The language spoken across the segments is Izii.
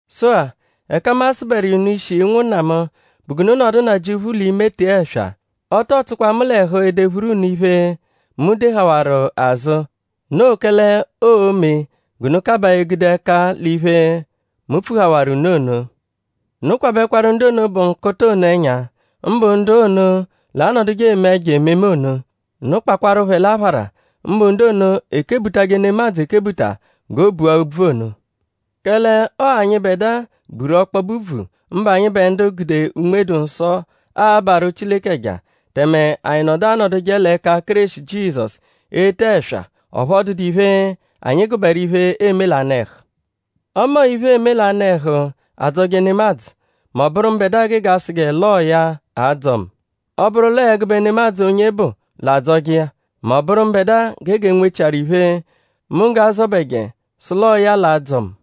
Sụ-a; ẹka mu a-sụberu iya unu ishi; ụnwunna mu; bụ g'unu nọdu Nnajịuphu l'ime tee ẹswa. Ọ tọo tsụkwa mu l'ẹhu edephuru unu iphe, mu dehawaru azụ; noo kẹle oo-me g'unu kabaa egude ẹka l'iphe, mu pfuhawaru unu ono. Unu kwabẹkwaru ndu ono, bụ nkụta ono ẹnya; mbụ ndu ono l'anọduje eme ẹjo ememe ono. Unu kpakwaru phẹ l'aphara; mbụ ndu ono, ekebutajẹ nemadzụ ekebuta g'o bua úbvù ono. Kẹle ọo anyịbedua buru ọkpobe úbvù; mbụ anyịbe ndu gude Unme-dụ-Nsọ abarụ Chileke ẹja; tẹme anyi nọdu anọduje l'ẹka Kéreshi Jizọsu ete ẹswa; ọphu ọ dụdu iphe, anyi gụberu iphe, eeme l'anụ-ẹhu. Ọme ọo iphe, eeme l'anụ-ẹhu adzọje nemadzụ mẹ ọ bụru mbẹdua gege asụje l'ọo ya a-dzọ mu. Ọ -bụru l'ọ ẹgube nemadzụ onye bụ l'adzọje iya; mẹ ọ -bụru mbẹdua gege enwechiaru iphe, mu g'a-zọbeje sụ l'ọo ya l'a-dzọ mu.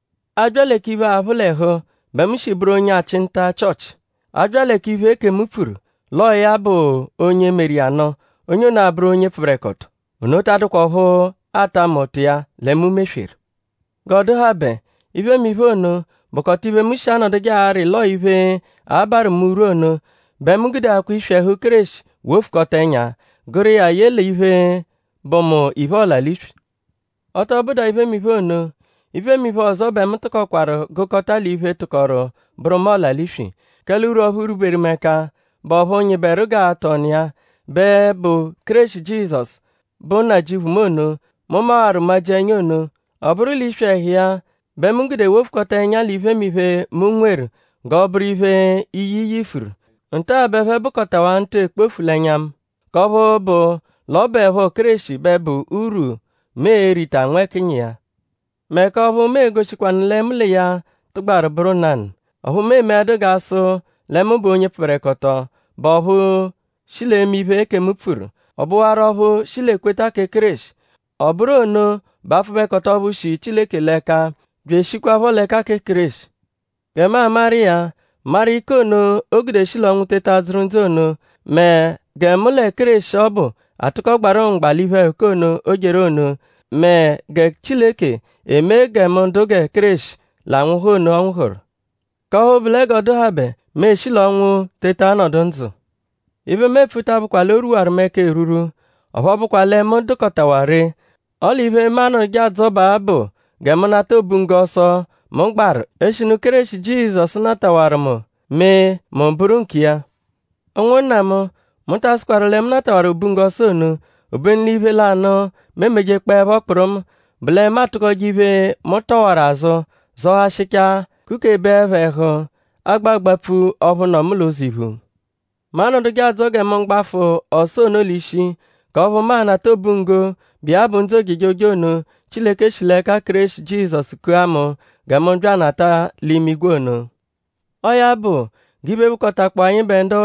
A -bya lẹ k'iphe, aphụ l'ẹhu bẹ mu shi bụru onye achị nta Chịochi. A -bya lẹ k'iphe, ekemu pfuru sụ l'ọo ya bụ onye -meru iya nụ; onye ono abụru onye pfụberekoto; ono ta adụkwa ọphu aata mu ụta iya lẹ mu mesweru. G'ọ dụhabe; iphemiphe ono, bụkota iphe, mu shi anọduje arị l'ọo iphe, a-barụ mu urwu ono bẹ mu gudeakwa iswi ẹhu Kéreshi wofukọta ẹnya; gụru iya ye l'iphe, bụ mu iphe, ọla-l'iswi. Ọ tọ bụdua iphemiphe ono; iphemiphe ọzo bẹ mu tụkokwaru gụkota l'iphe, tụkoru bụru mu ọla-l'iswi; kẹle urwu ọphu rwuberu mu ẹka, bụ ọphu nyịberu g'atụ ọnu iya, bẹ bụ Kéreshi Jizọsu, bụ Nnajịuphu mu ono, mu mawaru majia ẹnya ono. Ọ bụru l'iswi ẹhu iya bẹ mu gude wofukọta ẹnya l'iphemiphe, mu nweru g'ọ bụru iphe, iyi yifuru. Nta-a bẹ ẹphe bụkotawaa ntụ ekpofu l'ẹnya mu; k'ọphu bụ l'ọ bụepho Kéreshi bẹ bụ urwu, mu e-rita nwẹkinyi iya. Mẹ k'ọphu mu e-goshikwanụ lẹ mu l'iya tụgbaru bụru nanụ. Ọphu mu emeẹdu g'a sụje lẹ mu bụ onye pfụberekoto, bụ ọphu shi l'eme iphe, ekemu pfuru; ọ bụwaru ọphu shi l'ekweta kẹ Kéreshi. Ọ bụru ono bụ apfụbekoto ọphu shi Chileke l'ẹka bya eshikwaphọ l'ẹka kẹ Kéreshi. Gẹ mu amaru iya; maru ike ono o gude shi l'ọnwu teta dzụru ndzụ ono; mẹ gẹ mu lẹ Kéreshi ọbu atụko gbarụ mgba l'iphe-ẹhuka ono, o jeru ono; mẹ gẹ Chileke emee gẹ mu dụ gẹ Kéreshi l'anwụhu ono, ọ nwụhuru; k'ọphu bụ lẹ g'ọ dụhabe mu eshi l'ọnwu teta nọdu ndzụ. Iphe, mu epfu ta abụkwa l'o rwuwaru mu ẹka erwurwu; ọphu ọ bụkwa lẹ mu dụkotawaa ree; ọle iphe, mu anọduje adzọbaa bụ gẹ mu nata obunggo ọso, mu gbaru; eshinu Kéreshi Jizọsu natawaru mu mee mu bụru nkiya. Ụnwunna mu; mu ta asụkwaru lẹ mu natawaru obunggo ọso ono; obenu l'iphe lanụ, mu emejekpọepho kpụrumu bụ lẹ mu atụkoje iphe, mu tọwaru azụ zọhashichaa kukebeẹpho ẹhu agba agbapfu ọphu nọ mu l'ụzo iphu. Mu anọduje adzọ gẹ mu gbafụ ọso ono l'ishi; k'ọphu mu a-nata obunggo, bụ iya bụ ndzụ ojejoje ono, Chileke shi l'ẹka Kéreshi Jizọsu kua mu gẹ mu bya anata l'imigwe ono. Ọo ya bụ; g'iphe, bụkotakpoo anyịbe ndu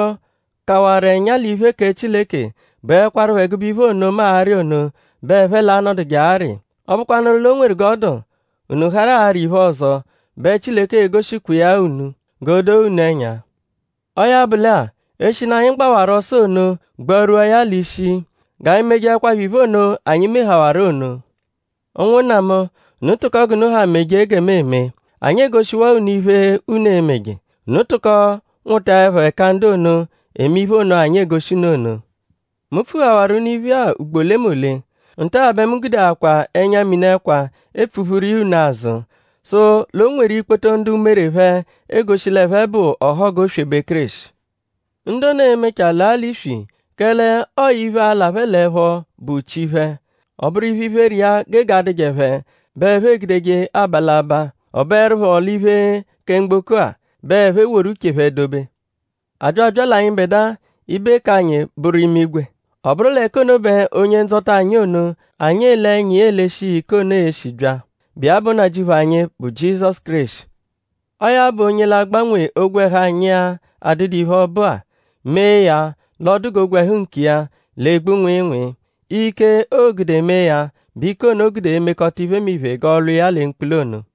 kawaru ẹnya l'iphe kẹ Chileke bụekwarupho ẹgube iphe ono, mu arị ono bẹ ẹphe l'a-nọduje arị. Ọ -bụkwanuru l'o nweru g'ọ dụ; unu harụ arị iphe ọzo bẹ Chileke e-goshikwa iya-a unu g'o doo unu ẹnya. Ọo ya bụ lẹ-a; eshinu anyi gbawaru ọso ono gbarwua ya l'ishi; g'anyi mejeẹkwapho iphe ono anyi mehawaru ono. Ụnwunna mu; unu tụko g'unu ha meje gẹ mu eme. Anyi egoshiwaa unu iphe, unu e-meje. Unu tụko nwụtaepho ẹka ndu ono, eme iphe ono, anyi egoshi unu ono. Mu pfuhawaru unu iphe-a ugbo olemole; nta-a bẹ mu gudeakwaa ẹnya-mini ẹkwa epfuphuru iya unu azụ; sụ l'o nweru ikpoto ndu umere phẹ egoshi l'ẹphe bụ ọhogu oswebe Kéreshi. Ndu ono e-mechaa laa l'iswi; kẹle ọo iphe, a-la phẹ l'ẹpho bụ chi phẹ. Ọ bụru iphe, iphere iya gege adụje phẹ bẹ ẹphe egudeje aba l'abaa. Ọ bụerupho l'iphe kẹ mgboko-a bẹ ẹphe woru uche phẹ dobe. A bya abya l'anyịbedua; ibe k'anyi bụru imigwe. Ọ bụru l'ẹka ono bẹ Onye-Ndzọta anyi ono, anyi ele ẹnya iya eleshi iya ike ono e-shi bya, bụ iya bụ Nnajịuphu anyi, bụ Jizọsu Kéreshi. Ọo ya bụ onye l'a-gbanwe ogwẹhu anyi-a, adụdu iphe, ọ bụ-a; mee ya l'ọ dụ g'ogwẹhu nkiya, l'egbu nwịinwii. Ike, oo-gude mee ya bụ ike ono, o gude emekọta iphemiphe g'ọ lwa iya lẹ mkpula ono.